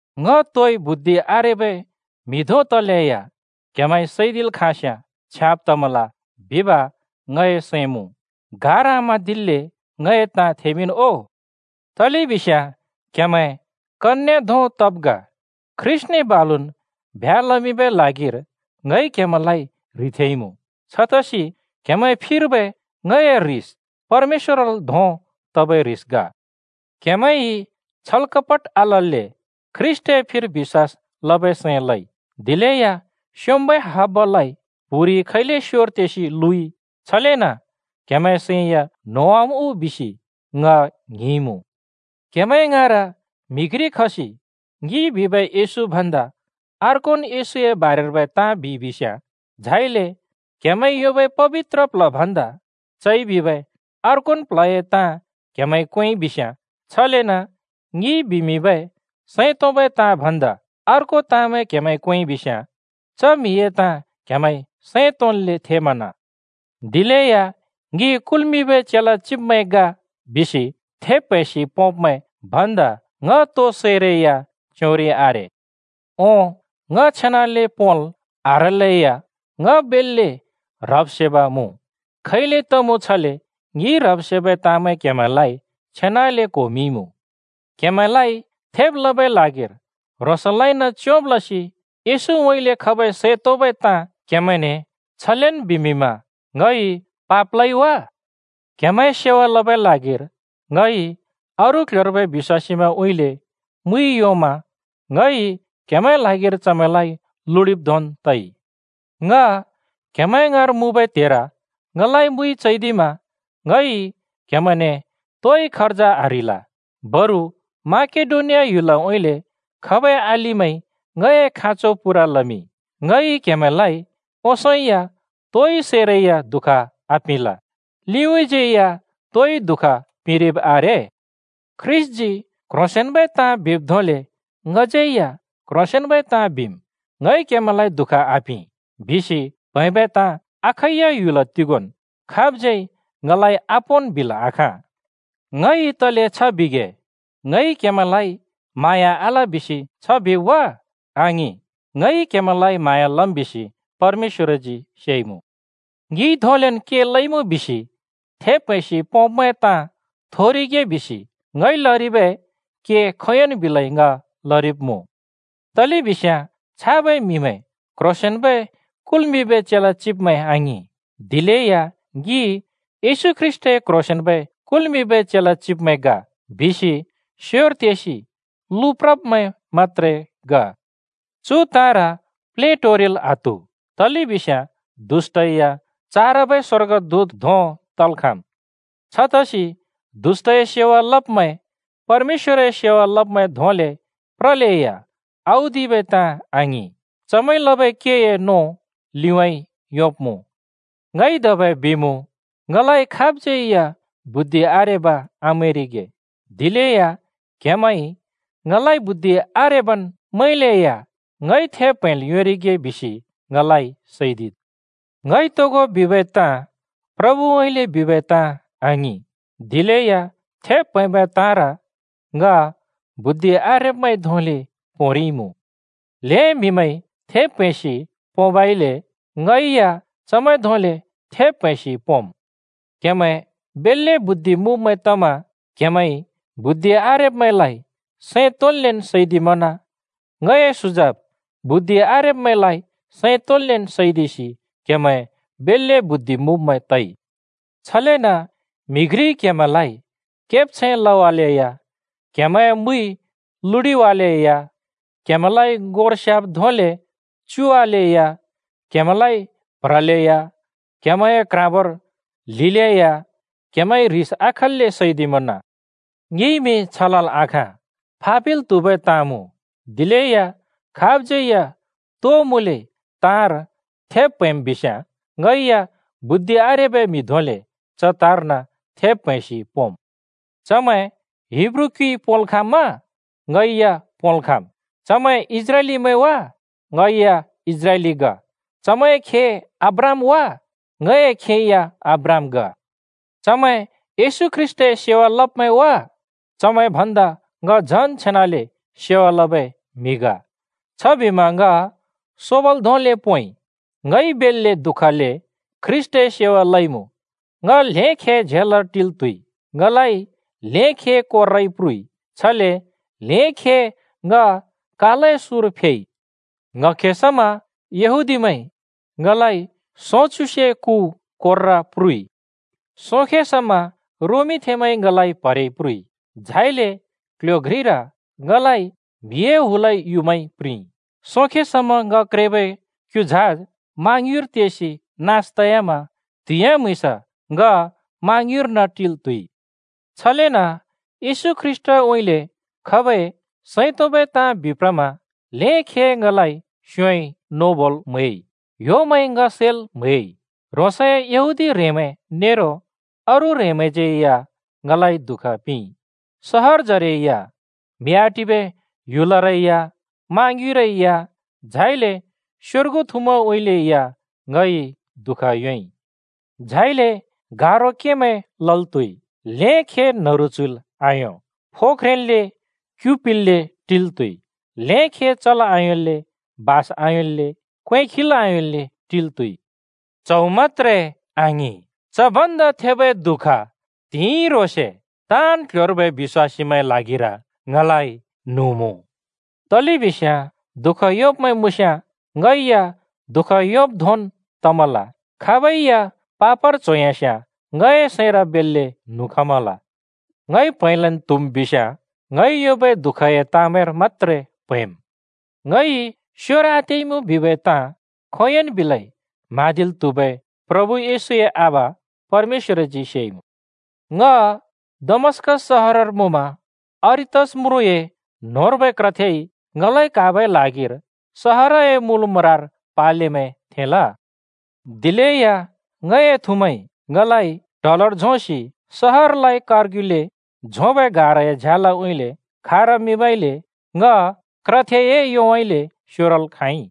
ङ तोइ बुद्धि आरेबै म्हि धों तलेया क्‍हेमैंइ सैदिल् खाँस्‍याँ छ्याँब तमल बिब ङए सैं मुँ। गार आम्हाँदिल्‍ले ङए ताँ थेमिंन् ओ! तलेबिस्याँ क्‍हेमैं कन्‍ये धों तब् ग, ख्रीष्‍टने बालुन् ब्ह्‍या लमिंबै ल्हागिर ङइ क्हेमैंलाइ ह्रिथेंइमुँ। छतसि क्‍हेमैंए फिर्बै ङए ह्रिस परमेश्‍वरल् धोंन् तबै ह्रिस ग। क्हेमैंइ छलकपट आलल्‍ले ख्रीष्‍टए फिर बिश्‍वास लबै सैं लइ, दिलेया स्‍योंम्‍बै हब्बालाइ प्‍हुरिइ खैले स्योर तेसि लुइ, छलेन क्हेमैंए सैं या न्होंवाम् उ बिसि ङ ङ्हिंइमुँ। क्‍हेमैं ङाँर म्‍हि घ्रि खसि ङिइ बिबै येशू भन्दा अर्कोन् येशूए बारेर्बै ताँ बिइ बिस्याँ, झाइले क्‍हेमैंइ योंबै पबित्र प्ल्ह भन्दा चइ बिबै अर्कोन् प्ल्हए ताँ क्हेमैंइ क्वेंइ बिस्याँ, छलेन ङिइ बिमिंबै सैं तोंबै ताँ भन्दा अर्को ताँमैं क्‍हेमैंइ क्वेंइ बिस्याँ, च म्हिए ताँ क्हेमैंइ सैं तोंन्ले थेमना! दिलेया “ङि कुल्मिंबै चेला चिब्मैं ग” बिसि थेब् प्हैंसि पोंब्मैं भन्दा ङ तोइ सैरै या च्योंरि आरे। ओं, ङ छेनाले पोंल् आह्रलैया ङ बेल्‍ले ह्रब् सेब मुँ। खैले तमुँ छले ङिइ ह्रब्-सेबै ताँमैं क्हेमैंलाइ छेनाले क्होमिंइमुँ। क्‍हेमैंलाइ थेब् लबै ल्हागिर ह्रोंसलाइन च्योंब् लसि येशूउँइँले खबै सैं तोंबै ताँ क्‍हेमैंने छलेन् बिमिंमा ङइ पाप लइ वा? क्‍हेमैंए सेवा लबै ल्हागिर ङइ अरू क्‍ल्‍ह्‍योर्बै बिश्‍वासीमैंउँइँले मुइ योंमा ङइ क्‍हेमैंए ल्हागिर चमैंलाइ लुडिब् धोंन् तइ। ङ क्‍हेमैं ङाँर मुँबै त्हेर ङलाइ मुइ चैदिमा ङइ क्‍हेमैंने तोइ खर्ज आह्रिल। बरु माकेडोनिया ह्‍युलउँइँले खबै अलिमैंइ ङए खाँचो पूरा लमिंइ। ङइ क्‍हेमैंलाइ ओंसों या तोइ सैरै या दुःख आपिंल, लिउँइँज्‍यै या तोइ दुःख पिंरिब आरे। ख्रीष्‍टजी क्ह्रोंसेंन्बै ताँ बिब् धोंले ङज्‍यै या क्ह्रोंसेंन्बै ताँ बिम्: “ङइ क्‍हेमैंलाइ दुःख आपिं” बिसि प्हैंबै ताँ अखैया ह्‍युल तिगोंन् खाबज्‍यै ङलाइ आपोंन् बिल् आखाँ। ङइ तले छ बिगे? ङइ क्‍हेमैंलाइ म्हाँया आल बिसि छ बिब् वा? आङिं! ङइ क्‍हेमैंलाइ म्हाँया लम् बिसि परमेश्‍वरजी सेइमुँ! ङिइ धोंलेन् के लइमुँ बिसि थेब् प्हैंसि पोंब्मैंए ताँ थोरिगे बिसि ङइ लरिबै के खोंयोंन् बिलै ङ लरिब्मुँ। तलेबिस्याँ छाबै म्‍हिमैं क्‍ह्रोंसेंन्‍बै कुल्मिंबै चेला चिब्मैं आङिं, दिलेया “ङि येशू ख्रीष्‍टए क्‍ह्रोंसेंन्‍बै कुल्मिंबै चेला चिब्मैं ग” बिसि स्योर तेसि लुप्रब्मैं मत्‍त्रे ग। चु ताँर प्लेटोरिल् आत्हु! तलेबिस्याँ दुष्‍टै या चारबै स्‍वर्गदूत धों तल् खाँम्। छतसि दुष्‍टए सेवा लब्मैं परमेश्‍वरए सेवा लब्मैं धोंले प्रलेया औदिबै ताँ आङिं। चमैंइ लबै केए नों लिउँइँ योंब्‍मुँ। ङइ धबै बिमुँ, ङलाइ खाबज्‍यै या बुद्धि आरेब आमैंरिगे। दिलेया क्‍हेमैंइ ङलाइ बुद्धि आरेबन् मैंलेया ङइ थेब् प्‍हैंल् योंरिगे बिसि ङलाइ सैदिद्। (ङइ तोगो बिबै ताँ प्रभुउँइँले बिबै ताँ आङिं, दिलेया थेब् प्‍हैंबै ताँर ङ बुद्धि आरेब्‍मैंइ धोंले पोंरिइमुँ। ल्हें म्‍हिमैंइ थेब् प्‍हैंसि पोंबइले ङै या चमैं धोंले थेब् प्‍हैंसि पोंम्।) क्‍हेमैं बेल्‍ले बुद्धि मुँब्मैं तमा क्‍हेमैंइ बुद्धि आरेब्‍मैंलाइ सैं तोंन्लेन् सैदिमना! ङए सुजाब (बुद्धि आरेब्‍मैंलाइ सैं तोंन्लेन् सैदिसि!) क्‍हेमैं बेल्‍ले बुद्धि मुँब्मैं तइ। छलेन म्‍हि घ्रिइ क्‍हेमैंलाइ केब्छैं लवालेया, क्‍हेमैंए मुइ लुडिवालेया, क्‍हेमैंलाइ ङोर स्‍याब् धोंले च्युवालेया, क्‍हेमैंलाइ प्ह्रलेया, क्‍हेमैंए क्‍ह्राँबोर ल्हिलेया क्‍हेमैंइ ह्रिस आखल्‍ले सैदिमना! ङिइमि छ लल् आखाँ, फा पिल् त्‍हुबै ताँ मुँ। दिलेया खाबज्‍यै या तो मुँले ताँर थेब् प्‍हैंम् बिस्याँ, ङै या बुद्धि आरेबै म्हि धोंले च ताँर्न थेब् प्हैंसि पोंम्। चमैं हिब्रू क्‍युइ पोंल् खाँम्‍मा? ङै या पोंल् खाँम्। चमैं इस्राएलीमैं वा? ङै या इस्राएली ग। चमैंए खे अब्राहाम वा? ङए खे या अब्राहाम ग। चमैं येशू ख्रीष्‍टए सेवा लब्मैं वा? चमैं भन्दा ङ झन् छेनाले सेवा लबै म्‍हि ग। छबिमा ङ सोबल धोंले पोंइ। ङइ बेल्‍ले दुःखले ख्रीष्‍टए सेवा लइमुँ, ङ ल्हें खे झेलर टिल् त्‍हुइ, ङलाइ ल्हें खे कोर्राइ प्रुइ, छले ल्हें खे ङ कालए सुँर फेइ। ङ्‌हखे समा यहूदीमैंइ ङलाइ सोंच्युसे कु कोर्रा प्रुइ। सोंखे समा रोमथेंमैंइ ङलाइ प्‍हरेइ प्रुइ, झाइले क्ल्ह्‍यो घ्रिर ङलाइ म्हिए हुलइ युँमाइ प्रिंइ। सोंखे समा ङ क्रेबै क्‍यु झाज मा ङ्युँइर तेसि नास तयामा त्हिंयाँ-म्‍हुँइँस ङ मा ङ्युँइर्न टिल् त्‍हुइ। छलेन येशू ख्रीष्‍टउँइँले खबै सैं तोंबै ताँ बिप्रमा ल्हें खे ङलाइ स्‍योंइ नोबोल् म्हैइ, ह्‍योमैंइ ङ सैल् म्हैइ, ह्रोंसए यहूदी ह्रेंमैं नेरो अरू ह्रेंमैंज्‍यै या ङलाइ दुःख पिंइ। सहरजरे या, म्‍हि आटिबै ह्‍युलरै या, मा ङ्युँइरै या, झाइले स्‍योर्गु थुमैंउँइँले या ङइ दुःख योंइ। झाइले गारो केमैं लल् त्‍हुइ, ल्हें खे न्‍हरु च्‍हुइल् आयों, फो ख्रेंन्ले क्यु पिल्‍ले टिल् त्‍हुइ, ल्हें खे चल् आयोंल्‍ले, बास आयोंल्‍ले, क्वें खिल् आयोंल्‍ले टिल् त्‍हुइ। च्हौ मत्‍त्रे आङिं, च भन्दा थेबै दुःख त्हिंइ ह्रोंसे ताँन् क्‍ल्‍ह्‍योर्बै बिश्‍वासीमैंए ल्हागिर ङलाइ न्हुँ मुँ। तलेबिस्याँ दुःख योंब्मैं मुँस्‍याँ ङै या दुःख योंब् धोंन् तमल। खाबै या पापर च्होयास्याँ ङए सैंर बेल्‍ले न्हुँ खमल। ङइ प्‍हैंलन् त्‍हुम् बिस्‍याँ ङइ योंबै दुःखए ताँमैंर मत्‍त्रे प्‍हैंम्। ङइ स्‍योर आतेइमुँ बिबै ताँ खोंयोंन् बिलै म्हाँदिल् त्हुबै प्रभु येशूए आबा परमेश्‍वरजी सेइमुँ। ङ दमस्‍कस सहरर मुँमा अरितस म्रुँए न्होंर्बै क्रथेइ ङलाइ क्‍हाबै ल्हागिर सहरए मुल म्रार पालेमैं थेंल। दिलेया ङए थुमैंइ ङलाइ ट्हलोर झोंसि सहरलाइ कारग्युले झोंबै गाराए झ्यालउँइँले खारमिंबइले ङ क्रथेए योउँइँले स्योरल् खाँइ।